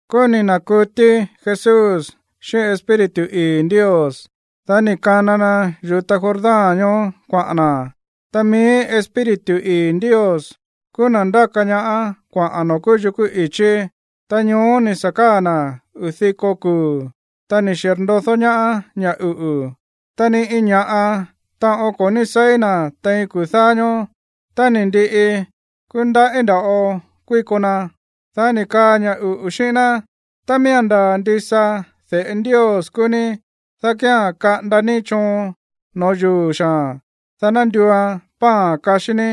Kúú ni̱ na̱kutí Jesús xíꞌín Espíritu ii̱ Ndios. Dá ni̱ kana na yu̱ta Jordán ñoó kuaꞌa̱n na̱. Ta mií Espíritu ii̱ Ndios kúú na̱ ndáka ñaá kuaꞌa̱n noo̱ kúú yukú i̱chí. Ta ñoó ni̱ sa̱ káa̱ na̱ uu̱ diko kuu̱, ta ni̱ xirndodó ñaá ña̱ uꞌu̱. Ta ni iin ña̱ꞌa taꞌon ko̱ ní seí na̱ tein kuu̱ dáá ñóó. Tá ni̱ ndiꞌi, kúú ndaꞌí nda̱ꞌo kuíko na. Dá ni̱ kaa ña̱ uꞌu̱ xíꞌín ná: ―Tá miía̱n ndaa̱ ndisa de̱ꞌe Ndios kúú ní, dá kía̱n kaꞌanda ní choon no̱ó yuu̱ xaa̱n, dá ná nduuan pan kaxí ní.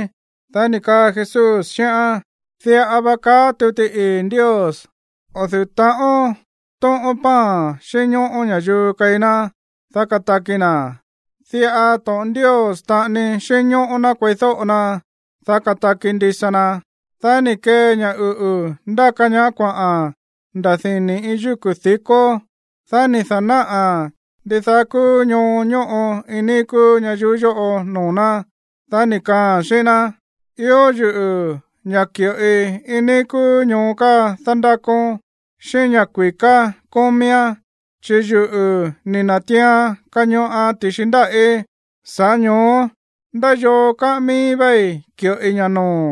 Dá ni̱ kaa Jesús xíꞌán: ―Diꞌa va kaá tuti ii̱ Ndios: “O̱ du̱ú ta̱ꞌón tóꞌón pan xínñóꞌó ña̱yuu keí ná, dá kataki na̱. Diꞌa to̱ꞌon Ndios taꞌani xínñóꞌó ná kueídóꞌo na, dá kataki ndisa na.” Dá ni̱ kee ña̱ uꞌu̱ ndáka ñaá kuaꞌa̱n nda̱ dini̱ iin yúku̱ di̱kó. Dá ni̱ da̱náꞌa̱n ndidaá kúú ñoo ñóꞌo iin níí kúú ñayuú yóꞌo noo̱ ná. Dá ni̱ kaaa̱n xíꞌín ná: ―Ió yuꞌu̱ ña̱ ki̱ꞌoi iin níí kúú ñoo káa dándákón, xíꞌín ña̱ kui̱ká kómíán, chi̱ yuꞌu̱ ni̱ na̱tiian kañoꞌan ti̱xi ndáꞌí. Sa̱ꞌá ño̱ó ndá yoo kaꞌán mií véí ki̱ꞌoi ña̱ noo̱.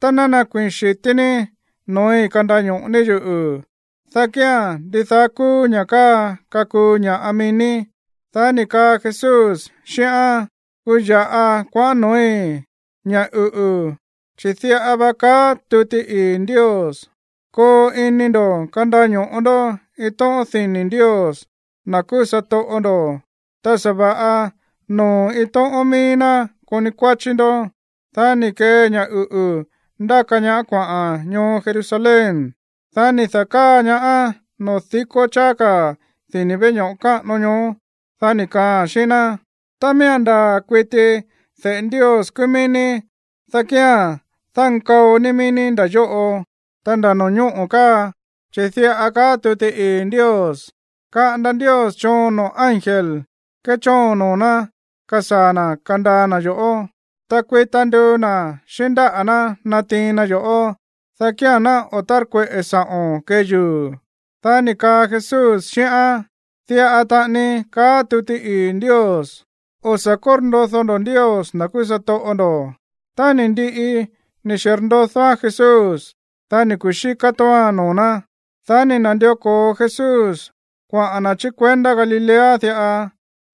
Tá ná nakuii̱n xi̱tí ní noo̱í kandaño̱ꞌo ní yuꞌu̱, dá kía̱n ndidaá kúú ña̱ káa kakuu ña̱ꞌa mií ní. Dá ni̱ kaa Jesús xíꞌán: ―Kuya̱ꞌa kuaꞌán noo̱í, ña̱ uꞌu̱, chi̱ diꞌa va kaá tuti ii̱ Ndios: “Koo ini ndo̱ kandaño̱ꞌo ndó iin tóꞌón dini̱ Ndios, na̱ kúú satoꞌo ndo̱, ta sa̱va̱ꞌa noo̱ iin tóꞌón míí ná koni kuáchí ndó.” Dá ni̱ kee ña̱ uꞌu̱ ndáka ñaá kuaꞌa̱n ñoo Jerusalén. Dá ni̱ da̱káa ñaáán noo̱ dikó cháá ka̱ dini̱ veꞌe ño̱ꞌo káꞌano ñoó. Dá ni̱ kaaa̱n xíꞌín ná: ―Tá miía̱n ndaa̱ kuiti de̱ꞌe Ndios kúú míí ní, dá kía̱n dánkao ní mií ní nda̱ yóꞌo, ta nda̱ no̱ñóꞌo̱ káa, chi̱ diꞌa kaá tuti ii̱ Ndios: Kaꞌanda Ndios choon noo̱ ángel kéchoon noo̱ ná kasaa̱ na̱ kandaa na̱ yo̱ꞌó. Ta kuita nduu na̱ xíꞌín ndáꞌa̱ ná natiin na yo̱ꞌó, dá kía̱n ná o̱ tárkueꞌe̱ sa̱ꞌo̱n kee yuu̱. Dá ni̱ kaa Jesús xíꞌán: ―Diꞌa taꞌani kaá tuti ii̱ Ndios: “O̱ sa̱ kórndodó ndó Ndios, na̱ kúú satoꞌo ndo̱.” Tá ni̱ ndiꞌi ni̱ xirndodóán Jesús, dá ni̱ kuxíká tóoan noo̱ ná. Dá ni̱ na̱ndió ko̱o Jesús kuaꞌa̱n na̱ chí kuendá Galilea diꞌa.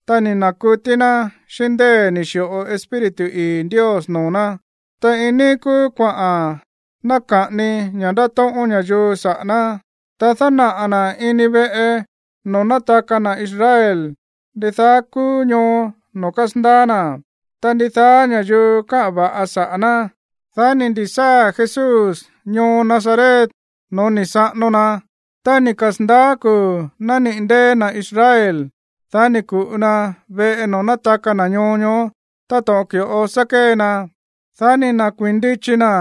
Ta ni̱ na̱kutí ná xíꞌín ndée̱ ni̱ xi̱ꞌo Espíritu ii̱ Ndios noo̱ ná. Ta iin níí kúú kuaꞌa̱n naka̱ꞌani ña̱ ndátóꞌón ña̱yuu saꞌa̱ ná. Ta dánaꞌa̱ na̱ ini veꞌe noo̱ nátaka na̱ Israel ndidaá kúú ñoo noo̱ kásandaá na̱. Ta ndidaá ña̱yuu káꞌa̱n va̱ꞌa saꞌa̱ ná. Dá ni̱ ndi̱sáa̱ Jesús ñoo Nazaret no̱ó ni̱ saꞌano na. Tá ni̱ kasa̱ndaá kuu̱ nániꞌi̱ ndée̱ na̱ Israel, dá ni̱ ku̱ꞌu na veꞌe noo̱ nátaka na̱ ñoo ñoó táto̱ꞌon ki̱ꞌo sá kée na. Dá ni̱ na̱kuíi̱n ndichi na̱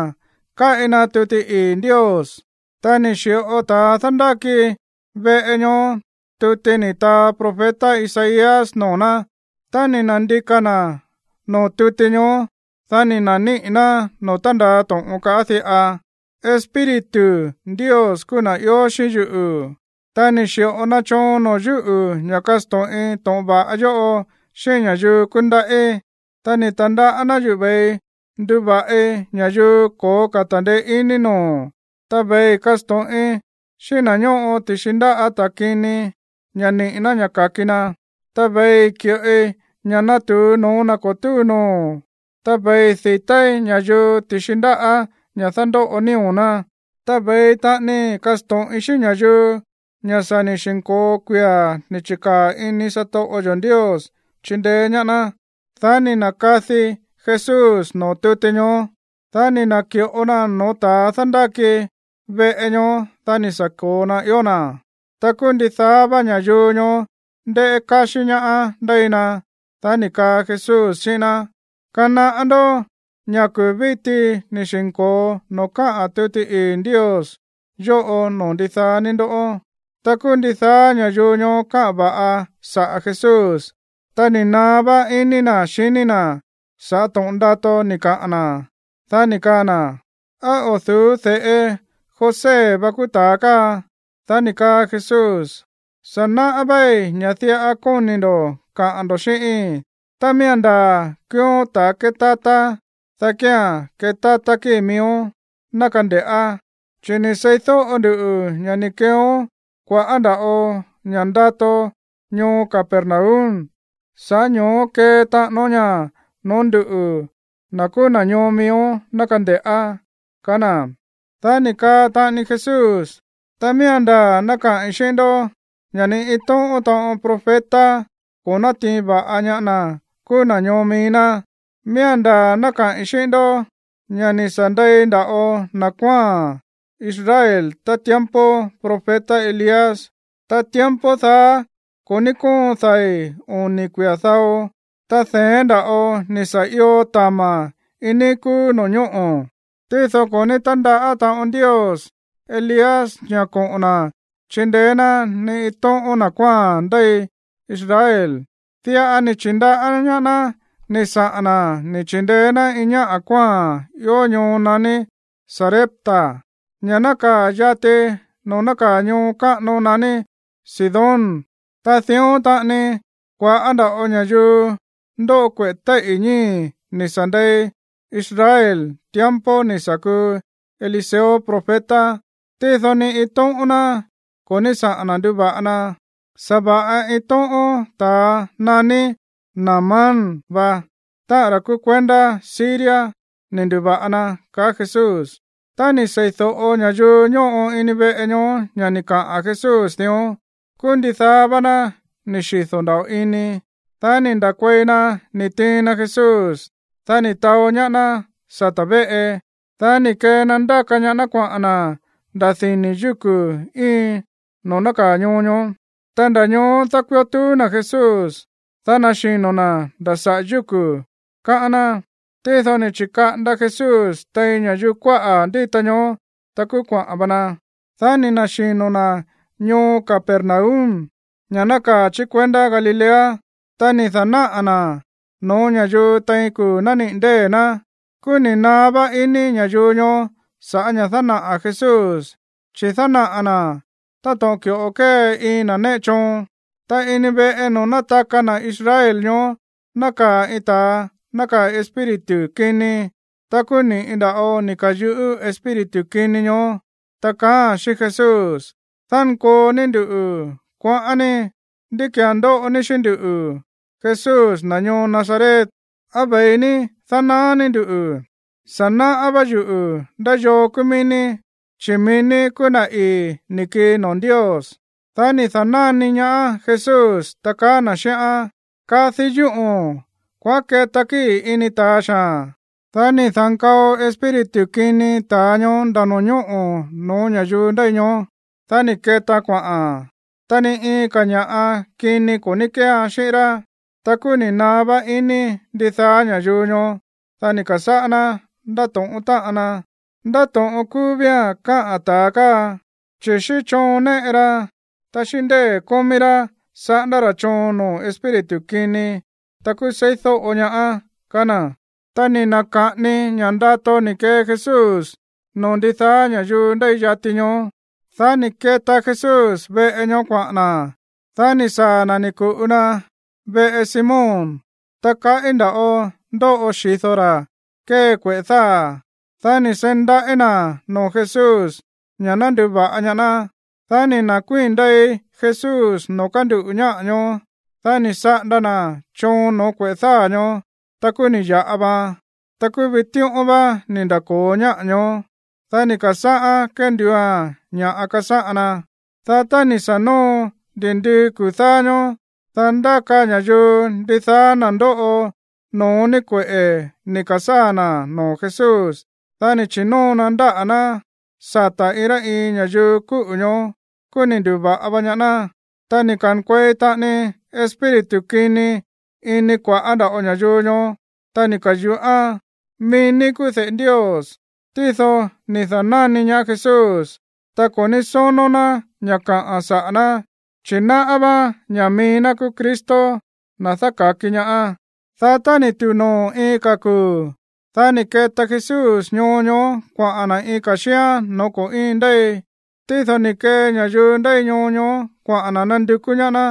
kaꞌi na tuti ii̱ Ndios. Ta ni̱ xi̱ꞌo ta̱a dándáki veꞌe ñoó tuti ni̱ taa profeta Isaías noo̱ ná. Ta ni̱ na̱ndika̱ na̱ noo̱ tuti ñoó. Dá ni̱ na̱níꞌi̱ ná noo̱ tándaa to̱ꞌon káꞌa̱n diꞌa: Espíritu Ndios kúú na̱ ió xíꞌín yuꞌu̱, ta ni̱ xi̱ꞌo na choon noo̱ yúꞌu̱ ña̱ kasto̱ꞌin to̱ꞌon va̱ꞌa yóꞌo xíꞌín ña̱yuu kúndaꞌí. Ta ni̱ ta̱ndaꞌá ná yuꞌu̱ ve̱ii nduva̱ꞌi ña̱yuu ko̱ó ka̱ ta̱ndeé iní noo̱, ta ve̱ii kasto̱ꞌin xíꞌín na̱ ñóꞌo ti̱xi ndáꞌa̱ ta̱ kini ña̱ niꞌi̱ ná ka̱ki na. Ta ve̱ii ki̱ꞌoi ña̱ natu̱u no̱ó na̱ ko̱ túu noo̱. Ta ve̱ii di̱táí ña̱yuu ti̱xi ndáꞌa̱ ña̱ dándóꞌo nío̱ ná. Ta ve̱ii taꞌani kasto̱ꞌin xíꞌín ña̱yuu ña̱ sa̱ ni̱ xi̱nko̱o kuia̱ ni̱ chi̱kaa̱ ini satoꞌo yo̱ Ndios chindeé ñaá ná. Dá ni̱ na̱kadi Jesús noo̱ tuti ñoó. Dá ni̱ na̱ki̱ꞌo naa̱n no̱ó ta̱a dándáki veꞌe ñoó. Dá ni̱ sa̱ ko̱o na ió na̱. Ta kúú ndidaá vá ña̱yuu ñoó ndéꞌé káxí ñaá ndéi na. Dá ni̱ kaa Jesús xíꞌín ná: ―Kanaꞌá ndó ña̱ kuu̱ víti ni̱ xi̱nko̱o noo̱ káꞌa̱n tuti ii̱ Ndios yóꞌo noo̱ ndidaá ní ndó. Ta kúú ndidaá ña̱yuu ñoó káꞌa̱n va̱ꞌa saꞌa̱ Jesús. Ta ni̱ naá vá iní na̱ xiní na̱ sa̱ꞌá to̱ꞌon ndato ni̱ kaꞌa̱n na̱. Dá ni̱ kaa na̱: ―¿Á o̱ du̱ú de̱ꞌe José vá kúú ta̱a káa? Dá ni̱ kaa Jesús: ―Sa̱ náꞌá véí ña̱ diꞌa kóni̱ ndo̱ kaꞌa̱n ndo̱ xíꞌíi̱n: “Tá miía̱n ndaa̱ kúúón ta̱a kétátá, dá kía̱n ketátá kíi̱ miíón, ná kande̱ꞌá. Chi̱ ni̱ seídóꞌo nduꞌu̱ ña̱ ni̱ keeón kua̱ꞌá nda̱ꞌo ña̱ ndato ñoo Capernaum, sa̱ꞌá ño̱ó kee taꞌánón ña̱ no̱ó nduꞌu̱, na̱ kúú na̱ ñoo miíón, ná kande̱ꞌá” ―kaá na̱. Dá ni̱ kaa taꞌani Jesús: ―Ta miía̱n ndaa̱ ná kaꞌi̱n xíꞌín ndó ña̱ ni iin tóꞌón taꞌon profeta ko̱ nátiin va̱ꞌa ñaá na̱ kúú na̱ ñoo mií ná. Miía̱n ndaa̱ ná kaꞌi̱n xíꞌín ndó ña̱ ni̱ sa̱ ndei nda̱ꞌo na̱ kuáa̱n Israel tá tiempo profeta Elías. Ta tiempo daá ko̱ ní kóon dai̱ oni̱ kuia̱ dao, ta de̱én nda̱ꞌo ni̱ sa̱ io tama̱ iin níí kúú no̱ñóꞌo̱. Tído ko̱ ní tándaꞌá taꞌon Ndios Elías ña̱ koꞌo̱n na̱ chindeé ná ni iin tóꞌón na̱ kuáa̱n ndéi Israel. Diꞌa ni̱ chi̱ndaꞌá ñaá ná ni̱ saꞌa̱n na̱ ni̱ chi̱ndeé ná iin ñá kuáa̱n ió ñoo naní Sarepta, ña̱ nákaa̱ yati noo̱ nákaa̱ ñoo káꞌano naní Sidón. Ta dión taꞌani kua̱ꞌá nda̱ꞌo ña̱yuu ndóꞌo kueꞌe̱ téíꞌi̱ ñíi̱ ni̱ sa̱ ndei Israel tiempo ni̱ sa̱ kuu Eliseo profeta. Tído ni iin tóꞌón ná ko̱ ní saꞌa̱n na̱ nduva̱ꞌa na. Sa̱va̱ꞌa iin tóꞌón ta̱a naní Naamán vá, táꞌa̱n ra̱ kúú kuendá Siria, ni̱ ndu̱va̱ꞌa na ―kaá Jesús. Tá ni̱ sei̱do̱ꞌo ña̱yuu ñóꞌo ini veꞌe ñoó ña̱ ni̱ kaꞌa̱n Jesús dión, kúú ndidaá vá ná ni̱ xido̱ nda̱ꞌo ini. Dá ni̱ nda̱kuei na ni̱ tiin na Jesús. Dá ni̱ taó ñaá ná sata̱ véꞌe. Dá ni̱ kee na ndáka ñaá ná kuaꞌa̱n na̱ nda̱ dini̱ yúku̱ íin noo̱ nákaa̱ ñoo ñoó. Ta nda̱ ñoó dákuió tuú na̱ Jesús, dá naxino̱ na̱ nda̱ saꞌa̱ yúku̱, káꞌán ná. Tído ni̱ chi̱kaꞌanda Jesús tein ña̱yuu kuáꞌa̱ ndíta ñoó, ta kúú kuaꞌa̱n va na. Dá ni̱ na̱xino̱ na̱ ñoo Capernaum, ña̱ nákaa̱ chí kuendá Galilea. Ta ni̱ da̱náꞌa̱ na̱ no̱ó ña̱yuu tein kuu̱ nániꞌi̱ ndée̱ ná. Kúú ni̱ naá vá iní ña̱yuu ñoó sa̱ꞌá ña̱ dánaꞌa̱ Jesús, chi̱ dánaꞌa̱ na̱ táto̱ꞌon ki̱ꞌo kée iin na̱ néꞌe choon. Ta ini veꞌe noo̱ nátaka na̱ Israel ñoó nákaa̱ iin ta̱a nákaa̱ iin espíritu kini. Ta kúú ni̱ꞌi nda̱ꞌo ni̱ ka̱yuꞌú espíritu kini ñoó, ta kaáa̱n xíꞌín Jesús: ―¡Dánkoo ní nduꞌu̱, kuaꞌán ní! ¿Ndí ki̱án ndóꞌo ní xíꞌín nduꞌu̱, Jesús, na̱ ñoo Nazaret? ¿Á ve̱i ní dánaá ní nduꞌu̱? Sa̱ náꞌá vá yuꞌu̱ ndá yoo kúú mií ní, chi̱ mií ní kúú na̱ ii̱ ni̱ kii noo̱ Ndios. Dá ni̱ da̱náni ñaá Jesús, ta kaá na̱ xíꞌán: ―¡Kadi yúꞌo̱n! ¡Kuaꞌán keta kíi̱ ini ta̱a xaa̱n! Dá ni̱ da̱nkao espíritu kini ta̱a ñoó nda̱ no̱ñóꞌo̱ no̱ó ña̱yuu ndéi ñoó. Dá ni̱ ketaan kuaꞌa̱n, ta ni iin ka̱ ña̱ꞌa kini ko̱ ní kéean xíꞌín rá. Ta kúú ni̱ naá vá iní ndidaá ña̱yuu ñoó, dá ni̱ ka̱sáꞌá ná ndátóꞌón táꞌan na: ―¿Ndá to̱ꞌon kúú vía̱n káꞌa̱n ta̱a káa, chi̱ xíꞌín choon néꞌe ra, ta xíꞌín ndée̱ kómí rá saꞌándá ra̱ choon noo̱ espíritu kini, ta kúú seídóꞌo ñaáán? ―kaá na̱. Ta ni̱ na̱ka̱ꞌani ña̱ ndato ni̱ kee Jesús noo̱ ndidaá ña̱yuu ndéi yati ñoó. Dá ni̱ keta Jesús veꞌe ñoó kuaꞌa̱n na̱. Dá ni̱ saa̱ na̱ ni̱ ku̱ꞌu na veꞌe Simón. Ta kaꞌí nda̱ꞌo ndóꞌo xi̱do ra̱ kée kueꞌe̱ dáa̱. Dá ni̱ seí ndaꞌí na̱ noo̱ Jesús ña̱ ná nduva̱ꞌa ñaá ná. Dá ni̱ na̱kuíi̱n ndei Jesús noo̱ kánduꞌu̱ ñáꞌa̱ ñoó. Dá ni̱ saꞌanda na̱ choon no̱ó kueꞌe̱ dáa̱ ñoó, ta kúú ni̱ ya̱ꞌa vaan. Ta kúú vitíꞌón vá ni̱ nda̱ko̱o ñáꞌa̱ ñoó, dá ni̱ ka̱sáꞌá kénduua̱n ña̱ kasáꞌan na. Dá tá ni̱ sa̱ noo ndi̱ndii kuu̱ dáá ñóó, dá ndáka ña̱yuu ndidaá na̱ ndóꞌo no̱ó ni kueꞌe̱ ni̱ ka̱sáa̱ na̱ noo̱ Jesús. Dá ni̱ chi̱nóo na ndáꞌa̱ ná sata̱ iin rá iin ña̱yuu kúꞌu̱ ñoó, kúú ni̱ ndu̱va̱ꞌa va ñaá ná. Ta ni̱ ka̱nkuei taꞌani espíritu kini ini kua̱ꞌá nda̱ꞌo ña̱yuu ñoó, ta ni̱ ka̱yuꞌán: ―¡Mií ní kúú de̱ꞌe Ndios! Tído ni̱ da̱náni ñaá Jesús, ta ko̱ ní sónó ná ña̱ kaꞌa̱n saꞌa̱ ná. Chi̱ náꞌá váán ña̱ mií ná kúú Cristo, na̱ dáka̱ki ñaá. Dá tá ni̱ tu̱u noo̱ iin ka̱ kuu̱, dá ni̱ keta Jesús ñoo ñoó kuaꞌa̱n na̱ iin ka̱ xíán no̱ó ko̱ íin ndéi. Tído ni̱ kee ña̱yuu ndéi ñoo ñoó kuaꞌa̱n na̱ nandukú ñaá ná.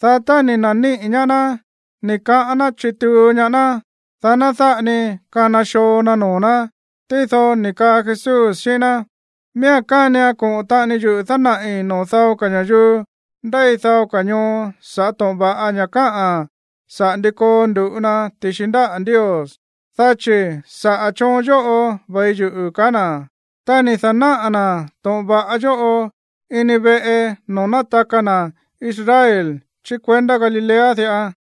Dá tá ni̱ na̱níꞌi̱ ñaá ná, ni̱ kaꞌán ná chituu ñaá ná, dá ná dáꞌa ni kana xoo na noo̱ ná. Tído ni̱ kaa Jesús xíꞌín ná: ―Miía̱n kánian koꞌo̱n taꞌani yuꞌu̱ dánaꞌi̱ noo̱ dao ka̱ ña̱yuu ndéi dao ka̱ ñoo sa̱ꞌá to̱ꞌon va̱ꞌa ña̱ káꞌa̱n saꞌa̱ ndi koo ndu̱ꞌu na ti̱xi ndáꞌa̱ Ndios, dá chi̱ saꞌa̱ choon yóꞌo ve̱i yuꞌu̱ ―kaá na̱. Ta ni̱ da̱náꞌa̱ na̱ to̱ꞌon va̱ꞌa yóꞌo ini veꞌe noo̱ nátaka na̱ Israel chí kuendá Galilea diꞌa.